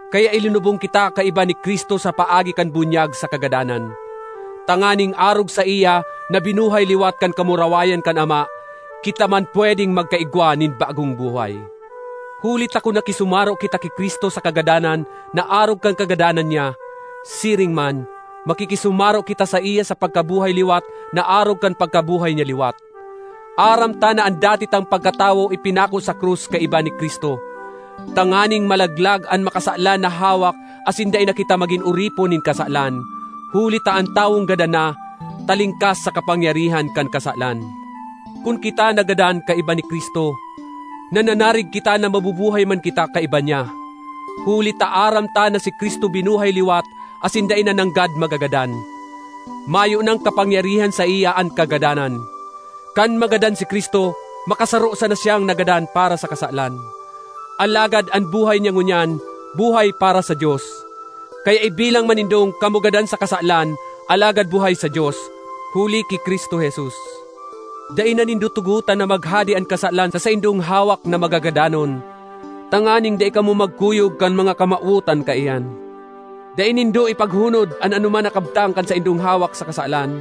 Kaya ilinubong kita kaiba ni Cristo sa paagi kan bunyag sa kagadanan, tanganing arog saiya na binuhay liwat kan kamurawayan kan Ama, kita man pwedeng magkaigwa nin bagong buhay. Huli ta kun nakisumaro kita ki Cristo sa kagadanan na arog kan kagadanan niya, siring man, makikisumaro kita saiya sa pagkabuhay liwat na arog kan pagkabuhay niya liwat. Aram ta na an dati tang pagkatawo ipinako sa krus kaiba ni Cristo, tanganing malaglag an makasalan na hawak asin dai na kita magin oripon nin kasalan. Huli ta an tawong gadan na, talingkas sa kapangyarihan kan kasalan. Kun kita nagadan kaiba ni Cristo, nananarig kita na mabubuhay man kita kaiba niya, huli ta aram ta na si Cristo binuhay liwat asin dai na nanggad magagadan; mayo nang kapangyarihan saiya an kagadanan. Kan magadan si Cristo makasaro sana siyang nagadan para sa kasalan; alagad an buhay niya ngunyan, buhay para sa Dios. Kaya ibilang man nindong kamo gadan sa kasalan alagad buhay sa Dios, huli ki Cristo Jesus. Dai na nindo tugotan na maghade an kasalan sa saindong hawak na magagadanon, tanganing dai kamo magkuyog kan mga kamawotan kaiyan. Dai nindo ipaghunod an anoman na kabtang kan saindong hawak sa kasalan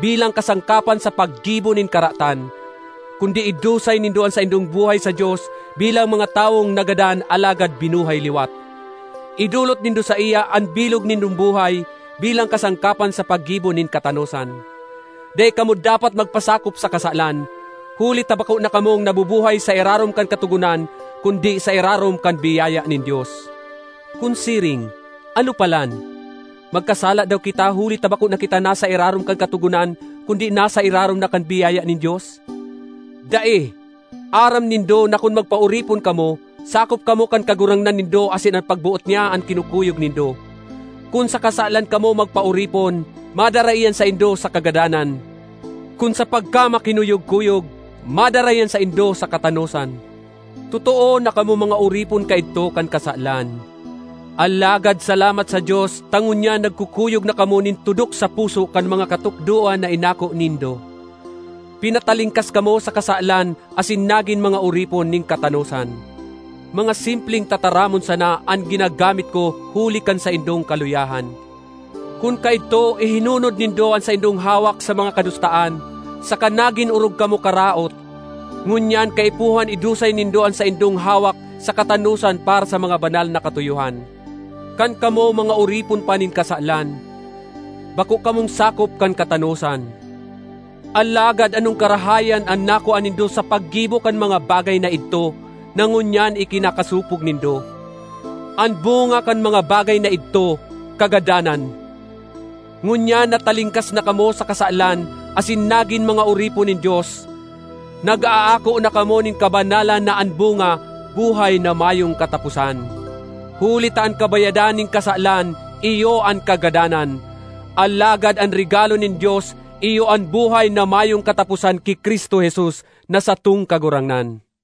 bilang kasangkapan sa paggibo nin karatan, kundi idusay nindo an saindong buhay sa Dios bilang mga tawong nagadan alagad binuhay liwat. Idolot nindo saiya an bilog nindong buhay bilang kasangkapan sa paggibo nin katanosan. Dai kamo dapat na magpasakop sa kasalan, huli ta bako na kamong nabubuhay sa irarom kan katogonan kundi sa irarom kan biyaya nin Dios. Kun siring, ano palan? Magkasala daw kita huli ta bako na kita nasa irarom kan katogonan kundi nasa irarom na kan biyaya nin Dios? Dai! Aram nindo na kun magpaoripon kamo, sakop kamo kan kagurangnan nindo asin an pagboot niya an kinukuyog nindo. Kun sa kasalan kamo magpaoripon, madara iyan saindo sa kagadanan; kun sa pagkamakinuyog-kuyog, madara iyan saindo sa katanosan. Totoo na kamo mga oripon kaidto kan kasalan, alagad salamat sa Dios ta ngunyan nagkukuyog na kamo nin tudok sa puso kan mga katukdoan na inako nindo. Pinatalingkas kamo sa kasalan asin nagin mga oripon nin katanosan. (Mga simpleng tataramon sana an ginagamit ko huli kan saindong kaluyahan.) Kun kaidto ihinunod nindo an saindong hawak sa mga kadustaan saka nagin orog kamo karaot, ngunyan kaipuhan idusay nindo an saindong hawak sa katanosan para sa mga banal na katuyohan. Kan kamo mga oripon pa nin kasalan, bako kamong sakop kan katanosan. Alagad anong karahayan an nakua nindo sa paggibo kan mga bagay na idto na ngunyan ikinakasopog nindo? An bunga kan mga bagay na idto, kagadanan! Ngunyan na talingkas na kamo sa kasalan asin nagin mga oripon nin Dios, nag-aako na kamo nin kabanalan na an bunga, buhay na mayong kataposan. Huli ta an kabayadan nin kasalan iyo an kagadanan; alagad an regalo nin Dios iyo an buhay na mayong kataposan ki Cristo Jesus na satong Kagurangnan.